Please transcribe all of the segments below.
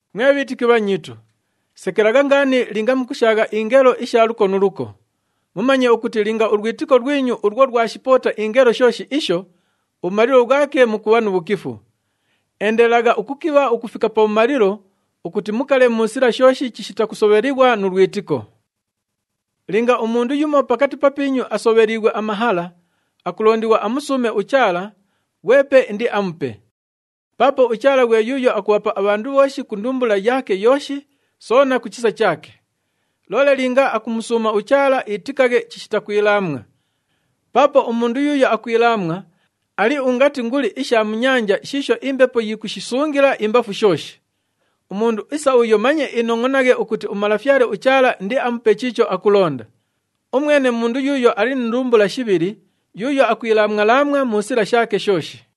Mwe bhiitiki bhanyiitu, sekelagha ngaani linga mukushaagha ingelo isha luko nu luko. Mumanye ukuti linga ulwitiko lwinyu ulwo lwashipoota ingelo shooshi isho, ubhumalilo bhwake mukubha nu bhukifu. Endelelagha ukukibha ukufika pabhumalilo ukuti mukale mu sila shooshi chishita kusobhelighwa nu lwitiko. Linga umundu yumo pakati papiinyu asobheliighwe amahala, akulondighwa amusuume uChaala, ghwepe indiamupe. Paapo uChaala ghwe yuuyo akubhapa abhandu bhooshi ku ndumbula yaake yooshi, soona ku chisa chaake. Loole linga akumusuuma uChaala, itikaghe chishita kwilaamwa. Paapo umundu yuuyo akwilaamwa, ali ungati nguli isha mu nyanja shiisho imbepo yikushisungila imbafu shooshi. Umundu isa uyo manye inongʼonaghe ukuti uMalafyale uChaala indiamupe chiicho akulonda. Umwene mundu yuuyo ali ni ndumbula shibhili, yuuyo akwilaamwa-laamwa mu sila shaake shooshi.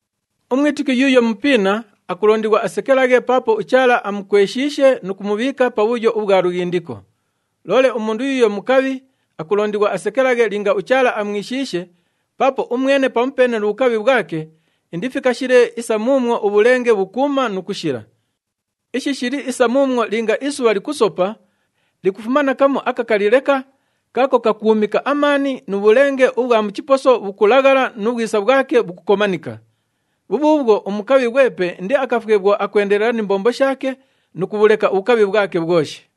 Umwitiki yuuyo mupiina akulondighwa asekelaghe paapo uChaala amukweshiishe nu kumubhiika pabhuyo ubhwa lughindiko. Loole umundu yuuyo mukabhi akulondighwa asekelaghe linga uChaala amwishiishe paapo umwene pamupeene nu bhukabhi bhwake indifikashile isa muumwo ubhulenge bhukuuma nu kushila. Ishi shili isa muumwo linga isubha likusopa, likufuma na kamu akakali leka kaako kakuumika amaani, nu bhulenge ubhwa mu chiposo bhukulaghala nu bhwisa bhwake bhukukomanika. Bhubhuubhwo umukabhi ghwepe indiakafwe bhwo akwendelela ni mbombo shaake nu kubhuleka ubhukabhi bhwake bhwoshi.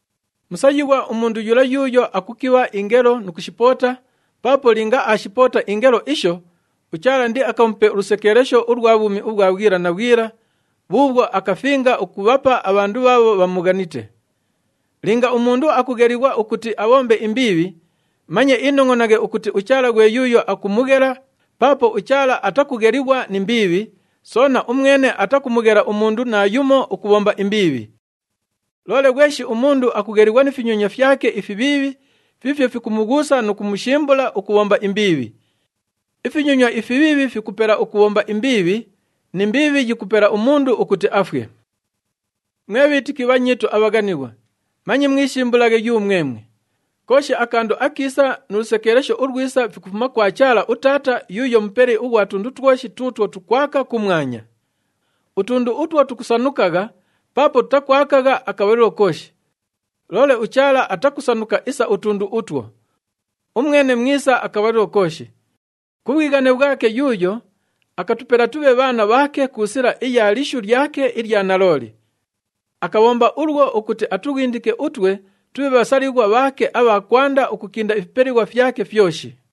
Musayighwa umundu yula yuuyo akukibha ingelo nu kushipoota paapo linga aashipoota ingelo isho, uChaala indiakamupe ulusekeelesho ulwa bhwumi ubhwa bhwila na bhwila bhuubhwo akafinga ukubhapa abhandu bhaabho bhamughanite. Linga umundu akughelighwa ukuti abhombe imbiibhi, manye inongʼonaghe ukuti uChaala ghwe yuuyo akumughela paapo uChaala atakughelighwa ni mbiibhi, soona umwene atakumughela umundu naayumo ukubhomba imbiibhi. Loole ghweshi umundu akughelighwa ni finyonywa fyake ifibhiibhi fiifyo fikumughuusa nu kumushimbula ukubhomba imbiibhi. Ifinyonywa ifibhiibhi fikupela ukubhomba imbiibhi, ni mbiibhi yikupela umundu ukuti afwe. Mwe bhiitiki bhanyiitu abhaghanighwa, manye mwishimbulaghe yumwemwe. Kooshi akandu akiisa nu lusekeelesho ulwisa fikufuma kwa Chaala uTaata yuuyo Mupeli ughwa tundu twoshi tuutwo tukwaka kumwanya. Utundu utwo tukusanukagha paapo tutakwakagha akabhalilo kooshi. Loole uChaala atakusanuka isa utundu utwo. Umwene mwisa akabhalilo kooshi. Ku bhwighane bhwake yuuyo, akatupela tubhe bhaana bhaake ku sila iya lishu lyake ilya nalooli. Akabhomba ulwo ukuti atughindike utwe tubhe bhasalighwa bhaake abha kwanda ukukinda ifipelighwa fyake fyoshi.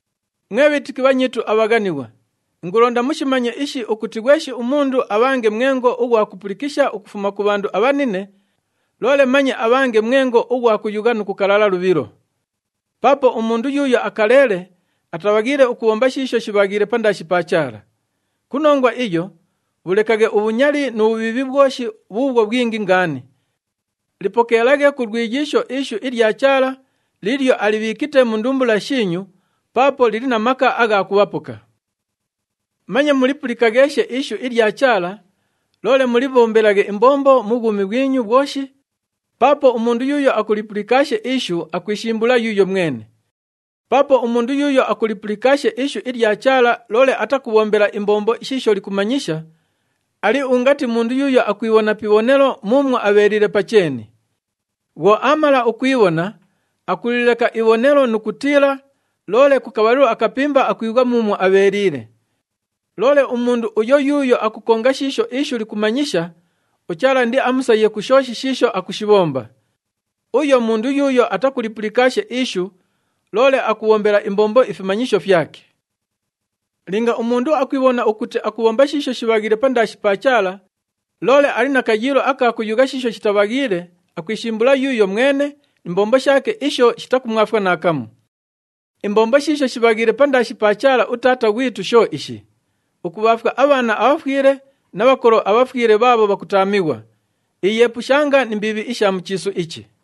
Mwe bhiitiki bhanyiitu abhaghanighwa, ingulonda mushimanye ishi ukuti ghweshi umundu abhange mwengo ughwa kupulikisha ukufuma ku bhandu abhanine, loole manye abhange mwengo ughwa kuyugha nu kukalala lubhilo. Paapo umundu yuuyo akaleele, atabhaghiile ukubhomba shiisho shibhaghiile pandaashi pa Chaala. Ku nongwa iyo, bhulekaghe ubhunyali nu bhubhiibhi bhwoshi bhuubhwo bhwingi ngaani. Lipokeelaghe ku lwiyiisho ishu ilya Chaala liilyo alibhiikite mu ndumbula shiinyu paapo lili na maka agha kubhapoka. Manye mulipulikagheeshe ishu ilya Chaala, loole mulibhombelaghe imbombo mu bhwumi bhwinyu bhwoshi, paapo umundu yuuyo akulipulikaashe ishu akwishimbula yuuyo mwene. Paapo umundu yuuyo akulipulikaashe ishu ilya Chaala loole atakubhombela imbombo shiisho likumanyisha, ali ungati mundu yuuyo akwibhona pi ibhonelo muumwo abheeliile pa cheeni. Bhwo aamala ukwibhona, akulileka ibhonelo nu kutiila, loole ku kabhalilo akapimba akwibhwa muumwo abheeliile. Loole umundu uyo yuuyo akukonga shiisho ishu likumanyisha, uChaala indiamusaye ku shooshi shiisho akushibhomba. Uyo mundu yuuyo atakulipulikaashe ishu, loole akubhombela imbombo ifimanyisho fyake. Linga umundu akwibhona ukuti akubhomba shiisho shibhaghiile pandaashi pa Chaala, loole ali na kayiilo aka kuyugha shiisho shitabhaghiile, akwishimbula yuuyo mwene ni mbombo shaake isho shitakumwafwa naakamu. Imbombo shiisho shibhaghiile pandaashi pa Chaala uTaata ghwitu sho ishi, ukubhaafwa abhaana abhafwile na bhakolo abhafwile bhaabho bhakutaamighwa. Iyeepushanga ni mbiibhi isha mu chiisu ichi.